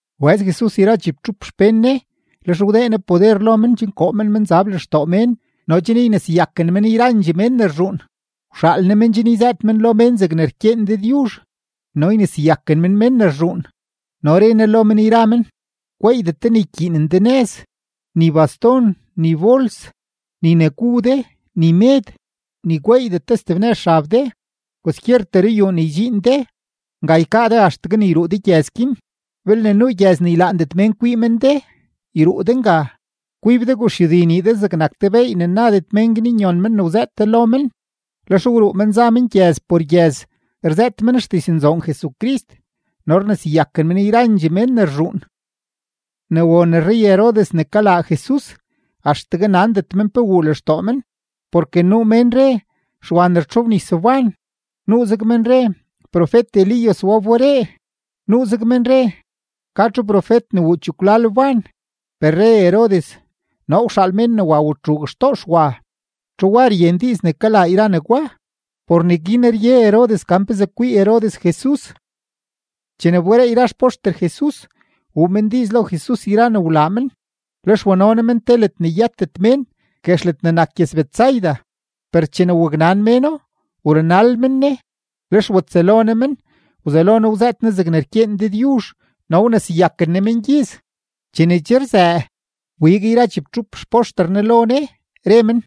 Wbëz Jesus yra chibtxup xpén Ne; lex wdee Ne poder lo men chen koo men menzab lextoo mén no chen yneseyaken men yrandxee mén ne rzhuun. Wxaal Ne men chen yzëët men lo mén zegne rkyeen Dëdyuzh no yneseyaken men mén ne rzhuun. No re Ne lo men yra men: ―Gweeydet de ne ykyiinen de nëz, ni baston, ni bols, ni ne gu de, ni med, ni gweeydet de steb nëz xab de. Kwaskyertee ruyuu ne ydxiin de, nga ykaa de axtegue ne yruu de gyëz guin. Belne nuu gyëz ne ylaandet mén kwii men de, yruu de nga; kwib de guxyudi nii de zegnak te beey ne nadet mén guin nyon men ne wzëët de lo men. Lex wruu men za men gyëz por gyëz, rzëët men xdiznzoon Jesucrist no rneseyaken men yrandxee mén ne rzhuun. Ne won rrey-Herodes ne kalaa Jesus, axtegue nandet men pe wuu lextoo men porke nuu mén re, Xwa ne rtxobnis wban. Nuuzeg men re, profet-Elías wa wberee; nuuzeg men re, ka txu profet ne wuu chekwlal wban. Per re Herodes: ―Noo wxaal mén ne wa men watxuug men xtoo Xwa. ¿Txu wa ryen diiz ne kalaa yra negwa? Por neguin rye Herodes gan pezee kwii Herodes Jesus. Chene wberee yra xpoxter Jesus, wuu men diiz lo Jesus yra ne wlaa men. Lex wano Ne men te ledne yëtet mén, guex ledne nak gyëz-Betsaida. Per chene waknan méno, wrunal men Ne. Lex watsëlo Ne men, wzelo Ne wzëët Ne zegne rkyeen Dëdyuzh, no wneseyaken Ne mengyiz. Chene che rzëë, wbig yra chibtxup xpoxter Ne lo Ne, re men: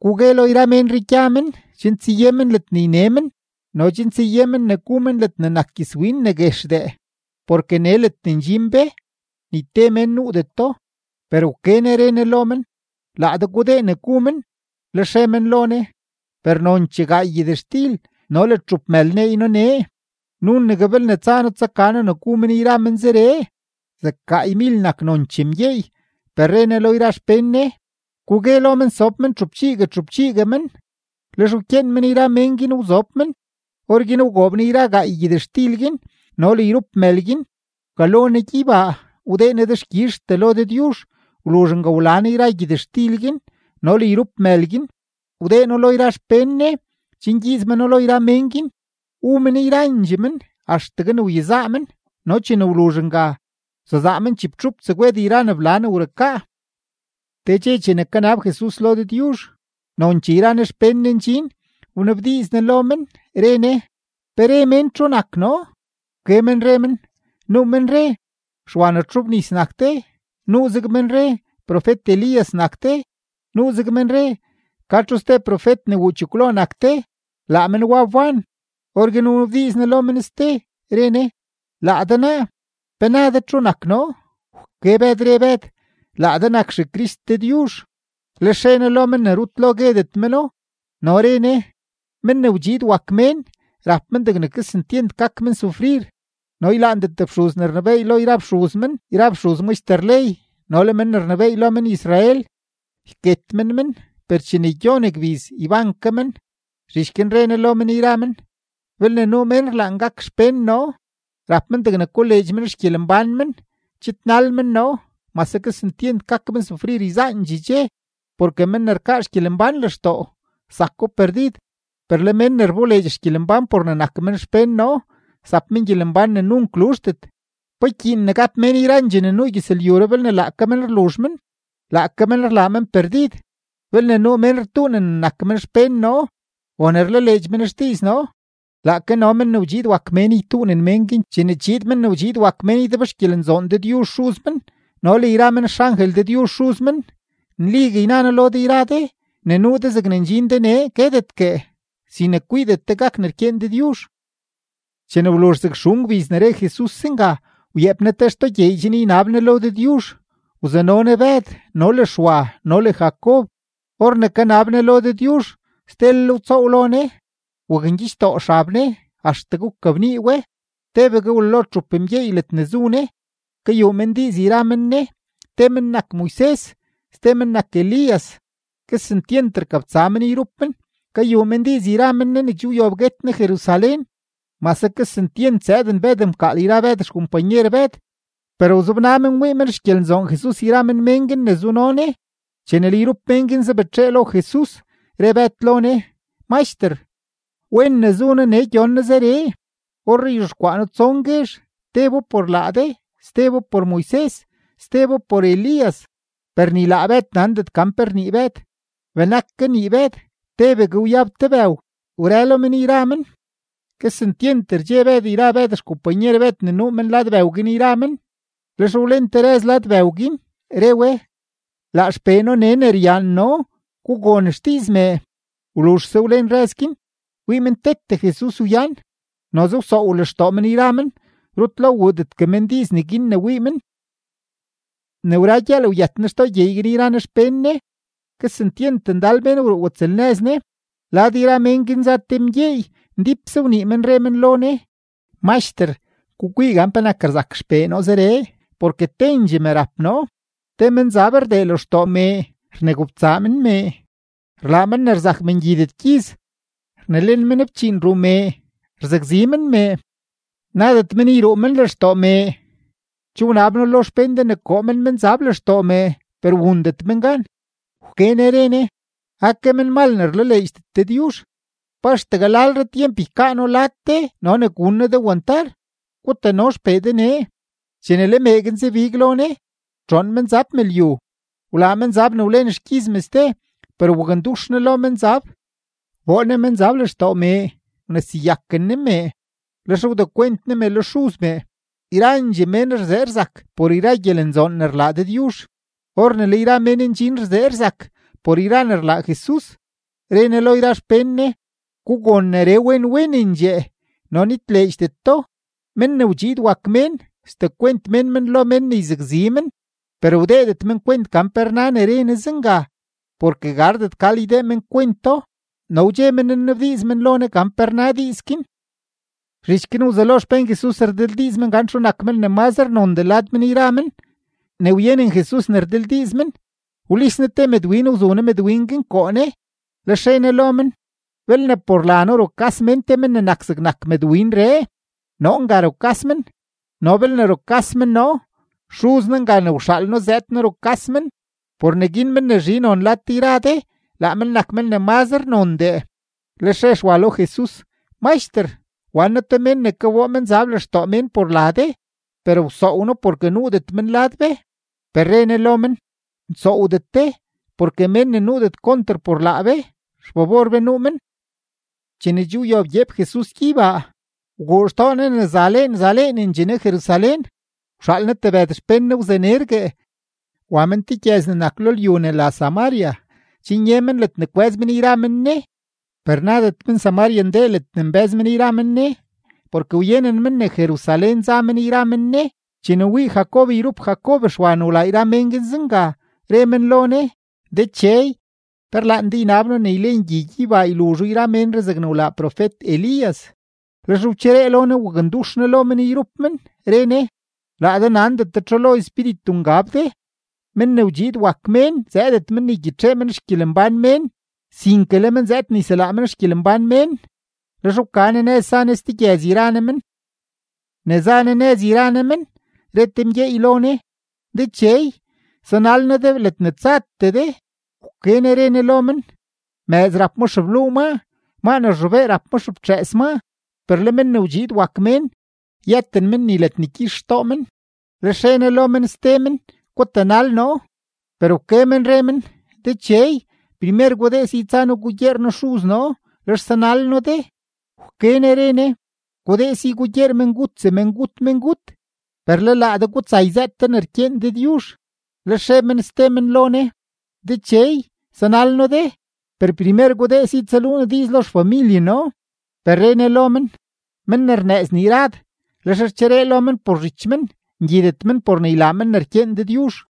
―Gugue lo yra ménree gya men chen tsaye men ledne yne men no chen tsaye men ne gu men ledne nak gyëzwin ne guexdee, porke nee ledne ndxin be, ni te mén nuudeto. Per wke Ne re Ne lo men: ―Laa de gudee ne gu men. Lex re men lo Ne: ―Per nonchee gaay gyëtxtil no le txup mël neey noo nee, nunegue belne tsa noo tsaka noo ne gu men yra men zeree. Zeg gaaymil nak nonchee mgyeey. Per re Ne lo yra xpén Ne: ―Gugue lo men sob men txupchiigue txupchiigue men. Lex wkyeen men yra mén guin wzob men. Orguin wgoob Ne yra gaay gyëtxtil guin no le yrup mël guin, wkalo Ne gyeybaa, wdee Ne dexkyizhtee lo Dëdyuzh. Wluzh nga wla Ne yra gyëtxtil guin no le yrup mël guin, wdee No lo yra xpén Ne chen ygyiiz meno lo yra mén guin. Wu men yrandxee men axtegue ne wyezaa men, no chene wluzh nga, wsezaa men chibtxup tsegwed yra ne bla ne wrukaa. Te dxe chene kanab Jesus lo Dëdyuzh, nonchee yra Ne xpén Ne ndxin, wnabdiiz Ne lo men, re Ne: ―¿Pe re mén txu nak noo? Wke men re men: ―Nuu men re, Xwa ne rtxobnis nak de; nuuzeg men re, profet-Elías nak de; nuuzeg men re, ka txu ste profet ne wuu chekwlo nak de, laa men wa wban. Orguin wnabdiiz Ne lo men ste, re Ne: ―Laa de naa, ¿pe na de txu nak noo? Wke Bëd, re Bëd: ―Laa de nak XeCrist Dëdyuzh. Lex re Jesus lo men ne rut lo guedet meno. No re Ne: ―Men ne wdxiid wak Mén, rap men degne kesentyent gak men sufrir, no ylaandet fxuz ne rnebééy lo yra fxuz men yra fxuz maxter ley no le men ne rnebééy lo men-Israel. Yket men men, per chene gyon gbiz, yban ke men. Zhich guin re Ne lo men yra men: ―Belne nuu mén rlaan gak xpén noo, rap men degne koleedx men xgyelembán men, chidnal men noo, mase kesentyent gak men sufrir yzaandxee dxe. Porke men ne rkaa xgyelembán lextoo, zako perdid; per le men ne rboleedx xgyelembán por ne nak men xpén noo, zap men gyelembán ne nunk luzhdet. ¿Pa ykyiin ne gap mén yrandxee ne nuu gyëzlyuree belne laake men rluzh men, laake men rlaa men perdid? Belne nuu mén rtuunen ne nak men xpén noo o ne rlaleedx men xdiiz noo, laake no Men ne wdxiid wak Mén ytuunen mén guin chene chiid Men ne wdxiid wak Mén ydebxgyelenzoon Dëdyuzh Xuz men no le yra men xangel Dëdyuzh Xuz men. Nligue yna noo lo de yra de, ne nuu de zegne ndxin de nee guetetgue sin ne kwiidet de gak ne rkyeen Dëdyuzh. Chene wluzh zeg xun gbiz ne re Jesus zenga, wyeep Ne te xtoo gyeey chen ynab Ne lo Dëdyuzh; wzano Ne Bëd no le Xwa no le Jacob. Or ne kanab Ne lo Dëdyuzh, stelel wtsoow lo Ne, wakngyichdoo xab Ne axtegue wkabnii we. Tebegue wlalo txup mgyeey ledne zu Ne, kayuu men diiz yra men Ne. Te men nak Moises, ste men nak Elías. Kesentyent rkabtsa men yrup men; kayuu men diiz yra men Ne ne che wyob guet Ne Jerusalén. Mase kesentyent zëëden Bëd mkaal yra Bëd xkompanyer Bëd, per wzobna men wii men xgyelenzoon Jesus yra Ne mén guin ne zuno Ne. Chene le yrup mén guin zabetxee lo Jesus, re Bëd lo Ne: ―Maxter, ¡wen ne zu noo nee gyon noo zeree! Orree yzhexkwaa noo tson guezh: tebo por laa de, stebo por Moises, stebo por Elías. Per ni laa Bëd nandet gan pe rnii Bëd. Benak kanii Bëd, tebegue wyab te bëw wrëlo men yra men; kesentyent rdxe Bëd yra Bëd xkompanyer Bëd ne nuu men lad bëw guin yra men. Lex wlen te rëz lad bëw guin, re we: ―Laa XPee noo nee ne ryaan noo; gugon xdiiz mee. Wluzhse wlen rëz guin, wii men tete Jesus wyan. Noze wsoow lextoo men yra men, rut lo wuudetgue men diiz neguin ne wii men. Ne wra gyëël wyët Jesus xtoo gyeey guin yra Ne xpén Ne; kesentyent ndal mén wruu watsëlnëz Ne. Lad yra mén guin za te mgyeey, ndípse wnii men, re men lo Ne: ―Maxter, gukwii gan penak rzak xpee noo zeree, porke tendxee me rap noo. Te menzab rdee lextoo mee, rnegobtsaa men mee, rlaa men ne rzak mee ngyidet gyiz, rnelen men fchiin ruu mee, rzakzi men mee; nadet men yruu men lextoo mee. Che wnab noo lo xpén de ne koo men menzab lextoo mee, per wundet men gan. Wke Ne re Ne: ―¡Ake menmal ne rlaleedxdet Dëdyuzh! ¿Pa axtegue lalre tyemp ykaa noo lad de no ne gun noo de wantar? Gutano xpee de nee. Chene le mee guin zabig lo Ne, wtxoon menzab me lyu, wlaa menzab ne wlen xgyiz mee ste; per wakndux Ne lo menzab, wboo Ne menzab lextoo mee, wneseyaken Ne mee, lex wdekwent Ne me lo xuz mee. Yrandxee mén rzee rzak por yra gyelenzoon ne rlaa Dëdyuzh. Or ne le yra mén ndxin rzee rzak por yra ne rlaa Jesus, re Ne lo yra xpén Ne: ―Gugon neree wen wenendxee no nitleedxdet do. Men ne wdxiid wak Mén, sdekwent mén men lo mén ne yzakzi men. Per wdeedet men kwent gan pe rna ne re Ne zenga, porke gardet gal ydee men kwento, no wdxe men nnabdiiz men lo Ne gan pe rna diiz guin. Zhich guin wzelo xpén Jesus rdildiiz men gan txu men nak men ne mazre nondee lad men yra men. Ne wyenen Jesus ne rdildiiz men, wlis Ne te mëdwin, wzu Ne mëdwin guin koo Ne. Lex re Ne lo men: ―Belne por la noo rukas mén te men ne nak zegnak mëdwinree, noo nga rukas men; no belne rukas men noo, Xuz noo nga ne wxaal noo zëëd noo rukas men. Por neguin men ne zhi non lad de yra de, laa men nak ne mazre nondee. Lex re Xwa lo Jesus: ―Maxter, wan noo te mén ne ka kaboo menzab lextoo mén por la de, per wsoow noo porke nuudet men lad be. Per re Ne lo men: ―Nsoowdet de; porke mén ne nuudet konter por laa be, xfabor be nuu men. Chene che wyob gyeep Jesus gyeybaa, wguu xtoo Ne ne zaleen zaleenendxee Ne Jerusalén. Wxaal Ne tebëd xpén Ne wzanergue; wa men te gyëz ne nak lo lyu ne la Samaria chen ye men ledne kwë́z men yra men Ne. Per nadet men-Samaria ndee ledne nbë́z men yra men Ne porke wyenen men ne Jerusalén za men yra men Ne. Chene wii Jacob yrup Jacob Xwa ne wlaa yra mén guin zenga, re men lo Ne: ―Dechey, ¿pe rlaan de ynab noo ne ylen gyi gyeybaa yluzho yra ménree zegne wlaa profet-Elías? Lex wcheree lo Ne, wakndux Ne lo men yrup men, re Ne: ―Laa de nandet de txu lo espíritu ngab de. Men ne wdxiid wak Mén zëëdet men ne ygyitxee men xgyelembán mén, sinke le men zëëd ne yselaa men xgyelembán mén. Lex wka Ne nëz za Ne ste gyëz yra Ne men. Ne za Jesus nëz yra Ne men, re te mgyeey lo Ne: ―Dechey, sanal noo de ledne tsatee de. Wke Ne re Ne lo men: ―Mëëz rap ma xebluu maa, maa ne rzhobee rap ma xeftxëës maa; per le Men ne wdxiid wak Mén, yëten men ni ledne gyix xtoo men. Lex re Ne lo men ste men: ―Gutanal noo. Per wke men re men: ―Dechey, primer gudee si tsa noo gugyeer noo xuz noo, lex sanal noo de. Wke Ne re Ne: ―Gudee si gugyeer mengut semengut mengut; per le laa de gutsa yzëët de ne rkyeen Dëdyuzh. Lex re men ste men lo Ne: ―Dechey, sanal noo de, per primer gudee si tsaluu noo diiz lo xfamilye noo. Per re Ne lo men: ―Men ne rnëëz nii rad, lex rcheree lo men por zhich men, ngyidet men por ne ylaa men ne rkyeen Dëdyuzh.